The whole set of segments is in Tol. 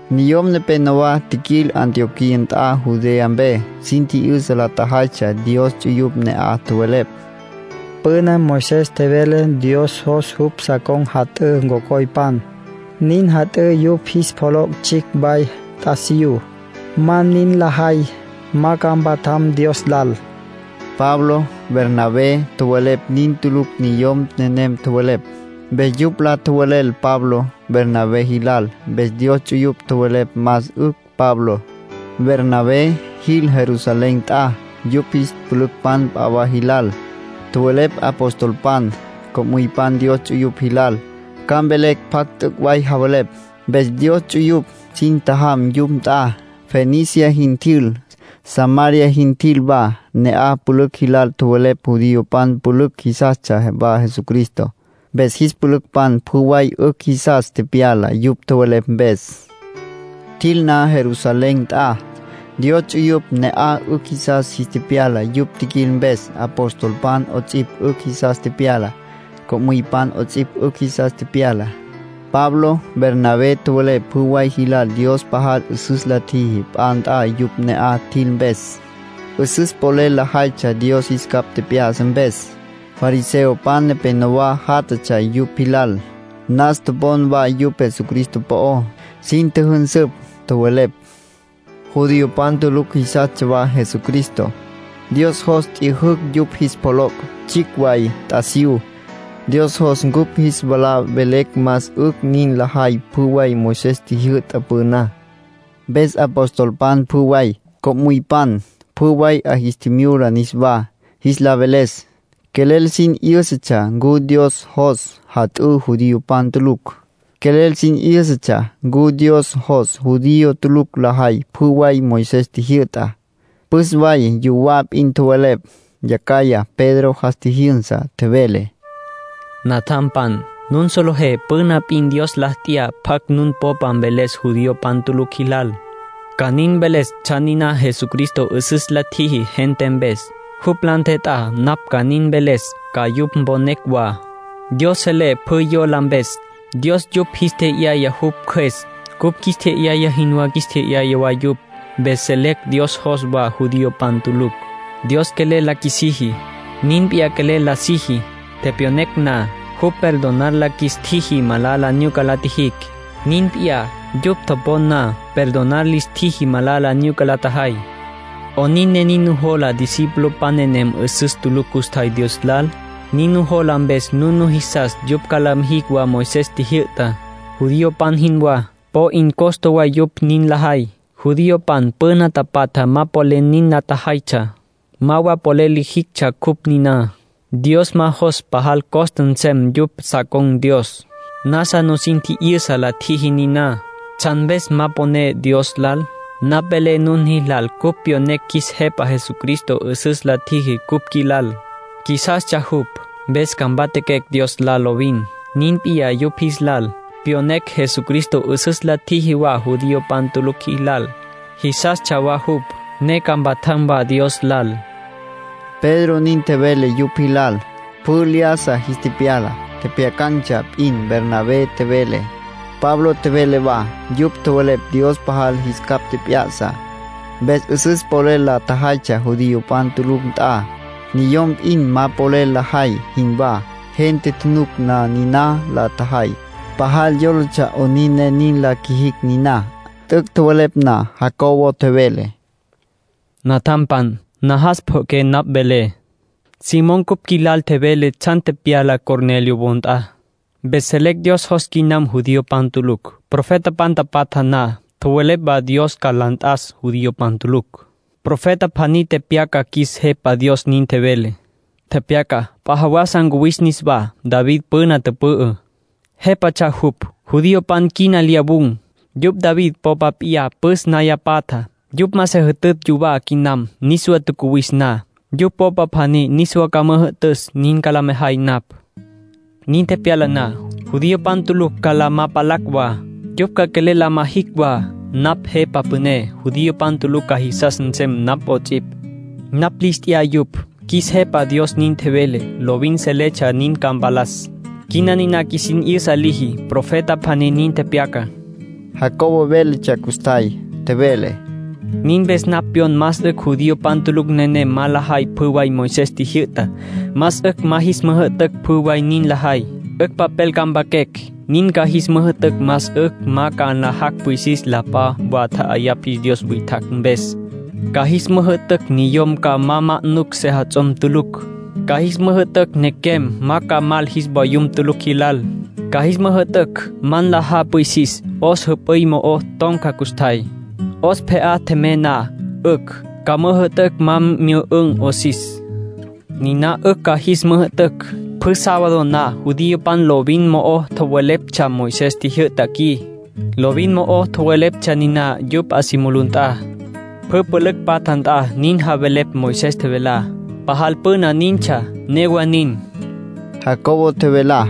Niyom nepénowa tjiquil Antioquía nt'a Judea mpe. Sin tji'yüsa la tjajaytsja Dios ts'uyupj ne'aj. Tjowelepj: “Püna Moisés tjevele Dios jos jupj sa con̈ jat'ǘ cocoypan, nin jat'ǘ yupj jis pjoloc' tsjicj way t'asiyú. Ma nin la jay, ma ca mpatjam Dios lal”, nin tjowelepj. Pablo, Bernabé, tjowelepj nin tulucj niyom nenem tjowelepj. Mpes yupj la tjowelel Pablo, Bernabé jilal. Mpes Dios ts'uyupj tjowelepj más 'ücj Pablo, Bernabé, jil Jerusalén nt'a, yupj jis pülücpan p'a wa jilal. Tjowelepj apostolpan, co'müypan Dios ts'uyupj jilal, ca mvelecj pjacj t'üc' way javelepj. Mpes Dios ts'uyupj sin tjajam yupj nt'a. Fenicia jin tjil, Samaria jin tjil wa. Ne'aj pülücj jilal tjowelepj judiopan tulucj jisastsja wa Jesucristo. Mpes jis pülücpan pjü way 'ücj jisas tepyala yupj tjowelepj mpes. Tjil na Jerusalén nt'a, Dios ts'uyupj ne'aj 'ücj jisas jis tepyala yupj tjiquil mpes. Apostolpan 'ots'ipj 'ücj jisas tepyala. Co'müypan 'ots'ipj 'ücj jisas tepyala. Pablo, Bernabé, tjowelepj pjü way jilal Dios pajal 'üsüs la tjiji p'a nt'a yupj ne'aj tjil mpes. 'Üsüs polel lajaytsja Dios jis capj tjep'ya'sa mpes. Fariseopan nepenowá játjatsja yupj jilal. Nas topon wa yupj Jesucristo po'ó. Sin tjüjünsüpj, tjowelepj: —Judiopan tulucj jisastsja wa Jesucristo. Dios jos t'yüjücj yupj jis pjoloc' tsjicj way t'asiyú. Dios jos cupj jis wala velecj más 'ücj nin lajay pjü way Moisés tjijyü'ta püná —nin tjowelepj. Mpes apostolpan pjü way, co'müypan, pjü way, 'a jis tjimyula niswá, jis la veles. Quelel sin 'yǘsatsja ncu Dios jos jat'ǘ judiopan tulucj. Quelel sin 'yǘsatsja ncu Dios jos judío tulucj lajay pjü way Moisés tjijyü'tá. Püs way yuwá p'in tjowelepj. Yacjaya Pedro jas tjijyünsa, tjevele: —Natjampan, nun solejé püna p'in Dios la t'ya pjacj nun popa mveles judiopan tulucj jilal, ca nin mveles tsjan niná Jesucristo 'üsüs la tjiji gente mpes. Jupj la ntjet'á napj ca nin mveles, ca yupj mponecj wa. Dios selé pjü yola mpes. Dios yupj jis tje'yaya jupj Cjües. Cupj qjuis tje'yaya jinwá jis tje'yaya wa yupj. Mpes selecj Dios jos wa judiopan tulucj. Dios quelel la qjuisiji. Nin p'iyá quelel la siji. Tepyonecj na, jupj perdonar la qjuis tjiji malala nyuca la tjijicj. Nin p'iyá, yupj topon na, perdonar lis tjiji malala nyuca la tjajay. ¿'Onin ne nin nujola discipulopan nenem 'üsüs tulucj custjay Dios lal? Nin nujola mpes nun nujisas yupj ca la mijicj wa Moisés tjijyü'tá, judiopan jinwá. Po 'in costa way yupj nin lajay. Judiopan püna tapatja ma polel nin la tjajaytsja, ma wa polel lijictsja cupj niná. Dios ma jos pajal costa nsem yupj sa con̈ Dios. Nasa nusin tji'yüsa la tjiji niná. ¿Tsjan mpes ma poné Dios lal? Napj velé nun jilal cupj pyonecj qjuis Jepa Jesucristo 'üsüs la tjiji cupj qjuilal. Qjuisastsja jupj, mpes ca mpatjaquecj Dios lal lovin. Nin p'iyá yupj jis lal. Pyonecj Jesucristo 'üsüs la tjiji wa judiopan tulucj jilal. Jisastsja wa jupj, ne ca mpatjam wa Dios lal —Pedro nin tjevele yupj jilal. Pjü lyájasa jis tepyala. Tjepjyacan̈tsja p'in Bernabé tjevele, Pablo tjevele wa. Yupj tjowelepj Dios pajal jis capj tjep'ya'sa, mpes 'üsüs polel la tjajaytsja judiopan tulucj nt'a, niyom p'in ma polel lajay jinwá. Gente tjunuc na niná la tjajay, pajal yólatsja 'onin ne nin la qjuijicj niná. T'üc' tjowelepj na, Jacobo tjevele: —Natjampan, najas pjo'oqué napj velé. Simón cupj qjuilal tjevele tsjan tepyalá Cornelio wo nt'a. Mpes selecj Dios jos quinam judiopan tulucj. Profetapan tapatja na, tjowelepj wa Dios ca la nt'as judiopan tulucj. Profeta pjaní tepyaca qjuis Jepa Dios nin tjevele. Tepyaca: ‘P'a jawasa ncuwis niswá. David püna tüpü'ü, jépatsja jupj. Judiopan quina lyawun̈, yupj David popa p'iyá püs naya patjá. Yupj ma se jütütj yuwá quinam. Niswa tjacuwis na, yupj popa pjaní niswa ca müjü'tüs, nin ca la mejay napj. Nin tepyala na, judiopan tulucj ca la ma palacj wa. Yupj ca quelel la ma jicj wa. Napj Jepa Püné. Judiopan tulucj ca jisas nsem napj 'ots'ipj. Napj lis t'ya yupj. Qjuis Jepa Dios nin tjevele. Lovin seletsja nin ca mpalas. Quina niná qjuisin 'yüsa liji.’ Profeta pjaní nin tepyaca. Jacobo véletsja custjay. Tjevele: —Nin mpes napj pyon más 'ücj judiopan tulucj nenem ma lajay pjü way Moisés tjijyü'tá. Más 'ücj ma jis müjü'tücj pjü way nin lajay. 'Ücj papel ca mpaquecj, nin ca jis müjü'tücj más 'ücj ma ca nlajacj pwisis la p'a wa tja'ayapj jis dios witjacj mpes. Ca jis müjü'tücj niyom ca ma ma'nucj sejats'om tulucj. Ca jis müjü'tücj nequem ma ca mal jis vayum tulucj jilal. Ca jis müjü'tücj ma nlajá pwisis 'os jüp'üy mo'o ton̈ca custjay. 'Os pje'á tjemey na, 'ücj. Ca müjü'tücj ma myü'ün̈ 'osis. Niná 'ücj ca jis müjü'tücj. Pjü sábado na judiopan lovin mo'o tjoweleptsja Moisés tjijyü'ta qui. Lovin mo'o tjoweleptsja niná yupj 'a si mulú nt'a. Pjü pülücj patja nt'a nin javelepj Moisés tjevelá. Pajal püna nintsja. Newa nin —Jacobo nin tjevele.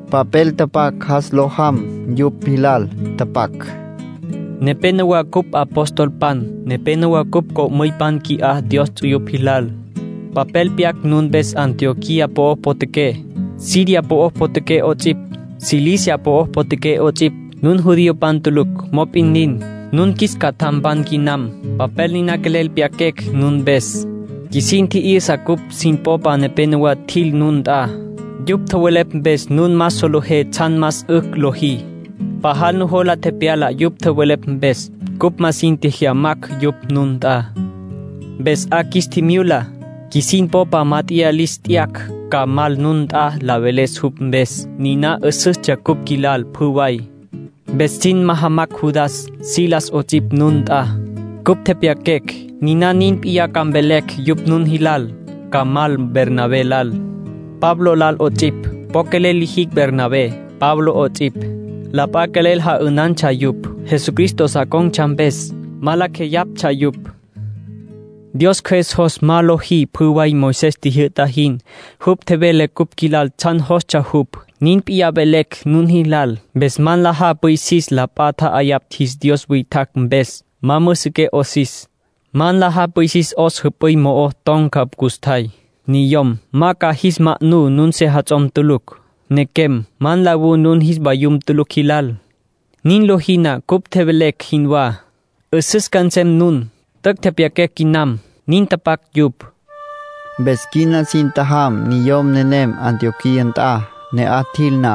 Papel tapac jas lo jam yupj jilal. Tapac: Nepénowa cupj apostolpan. Nepénowa cupj co'müypan qui'á Dios ts'uyupj jilal. Papel pyaquecj nun mpes Antioquía po'o potjaqué, Siria po'o potjaqué 'ots'ipj, Cilicia po'o potjaqué 'ots'ipj. Nun judiopan tulucj. Mop'in nin, nun qjuis catjampan quinam. Papel niná quelel pyaquecj nun mpes. Qjuisin tji'yüsa cupj sin popa nepenowá tjil nun nt'a. Yupj tjowelepj mpes nun ma solejé tsjan más 'ücj lojí. Pajal nujola tepyala yupj tjowelepj mpes. Cupj ma sin tjejyamacj yupj nun nt'a. Mpes 'a qjuis tjimyula, qjuisin popa mát'eya lis t'yacj ca mal nun nt'a la veles cupj mpes. Niná 'üsüstsja cupj qjuilal pjü way. Mpes sin majamacj Judas, Silas 'ots'ipj nun nt'a. Cupj tepyaquecj, niná nin p'iyá ca mvelecj yupj nun jilal. Ca mal Bernabé lal, Pablo lal 'ots'ipj. Po quelel lijicj Bernabé, Pablo 'ots'ipj. La p'a quelel ja'ünantsja yupj, Jesucristo sa con̈tsja mpes. Ma lacj jeyaptsja yupj. Dios Cjües jos ma lojí pjü way Moisés tjijyü'ta jin. Jupj tjevele cupj qjuilal tsjan jostsja jupj, nin p'iyá velecj nun jilal. Mpes ma nlajá pwisis la p'a tja'ayapj jis dios witjacj mpes. Ma müsiqué 'osis. Ma nlajá pwisis 'os jüp'üy mo'o ton̈ca custjay. Niyom, ma ca jis ma'nú nun sejats'om tulucj. Nequem, ma nlawú nun jis vayum tulucj jilal. Nin lojí na cupj tjevelecj jinwá, 'üsüs ca nsem nun. T'üc' tepyaquecj quinam. Nin tapac yupj. Mpes quina sin tjajam niyom nenem Antioquía nt'a. Ne'aj tjil na,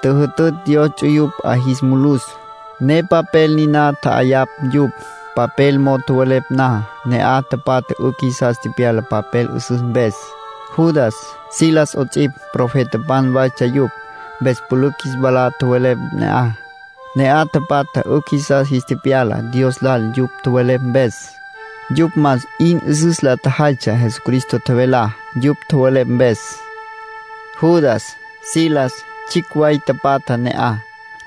tjüjütütj Dios ts'uyupj 'a jis mulus, ne papel niná tja'ayapj yupj. Papel mo'o tjowelepj na, ne'aj tapatja 'ücj jisas tepyala papel 'üsüs mpes. Judas, Silas 'ots'ipj, profetapan waytsja yupj. Mpes pülücj jis wala tjowelepj ne'aj. Ne'aj tapatja 'ücj jisas jis tepyala Dios lal yupj tjowelepj mpes. Yupj más 'in 'üsüs la tjajaytsja Jesucristo tjevelá, yupj tjowelepj mpes. Judas, Silas, tsjicj way tapatja ne'aj.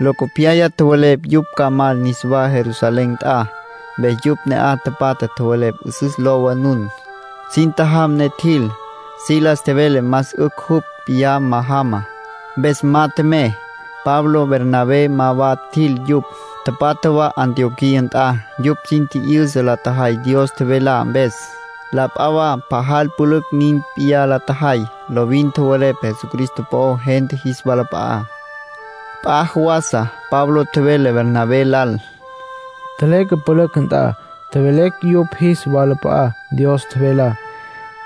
Locopyaya tjowelepj yupj ca mal niswá Jerusalén nt'a. Mpes yupj ne'aj tapatja tjowelepj 'üsüs lowa nun. Sin tjajam ne tjil. Silas tjevele más 'ücj jupj p'iyá ma jama. Mpes ma tjemey. Pablo, Bernabé ma wa tjil yupj. Tapatja wa Antioquía nt'a. Yupj sin tji'yüsa la tjajay Dios tjevelá mpes. La p'a wa pajal pülücj nin p'iyá la tjajay. Lovin tjowelepj Jesucristo po'ó gente jis walap'a'á. P'a jawasa Pablo tjevele Bernabé lal: “Tjeleque pülücj nt'a, tjevelecj yupj jis walap'a'á Dios tjevelá.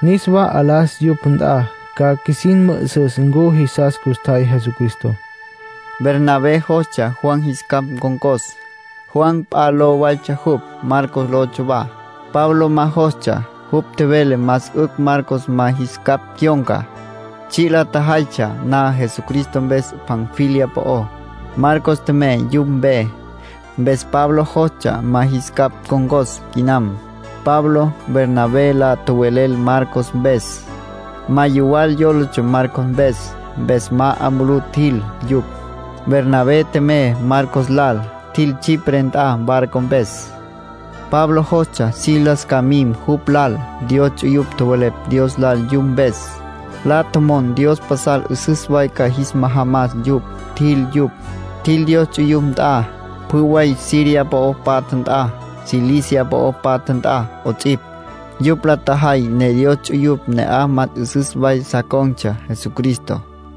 Niswá 'alas yupj nt'a. Ca qjuisin mü'üsüs ncu jisas custjay Jesucristo.” Bernabé jostsja Juan jis capj ncon̈cos. Juan p'a ló waytsja jupj, Marcos lotsja wa. Pablo ma jostsja. Jupj tjevele más 'ücj Marcos ma jis capj cyon̈ca. Tsji' la tjajaytsja na Jesucristo mpes Panfilia po'ó, Marcos tjemey yupj mpe. Mpes Pablo jostsja ma jis capj ncon̈cos quinam. Pablo, Bernabé, la tjowelel Marcos mpes. Ma yuwal yólatsja Marcos mpes. Mpes ma 'a mulú tjil yupj. Bernabé tjemey Marcos lal. Tjil Chipre nt'a barco mpes. Pablo jostsja Silas ca mim jupj lal. Dios ts'uyupj tjowelepj Dios lal yupj mpes. La tjomon Dios pasal 'üsüs way ca jis majamas yupj. Tjil yupj. Tjil Dios ts'uyupj nt'a, pjü way Siria po'o patja nt'a, Cilicia po'o patja nt'a 'ots'ipj. Yupj la tjajay ne Dios ts'uyupj ne'aj más 'üsüs way sa con̈tsja Jesucristo.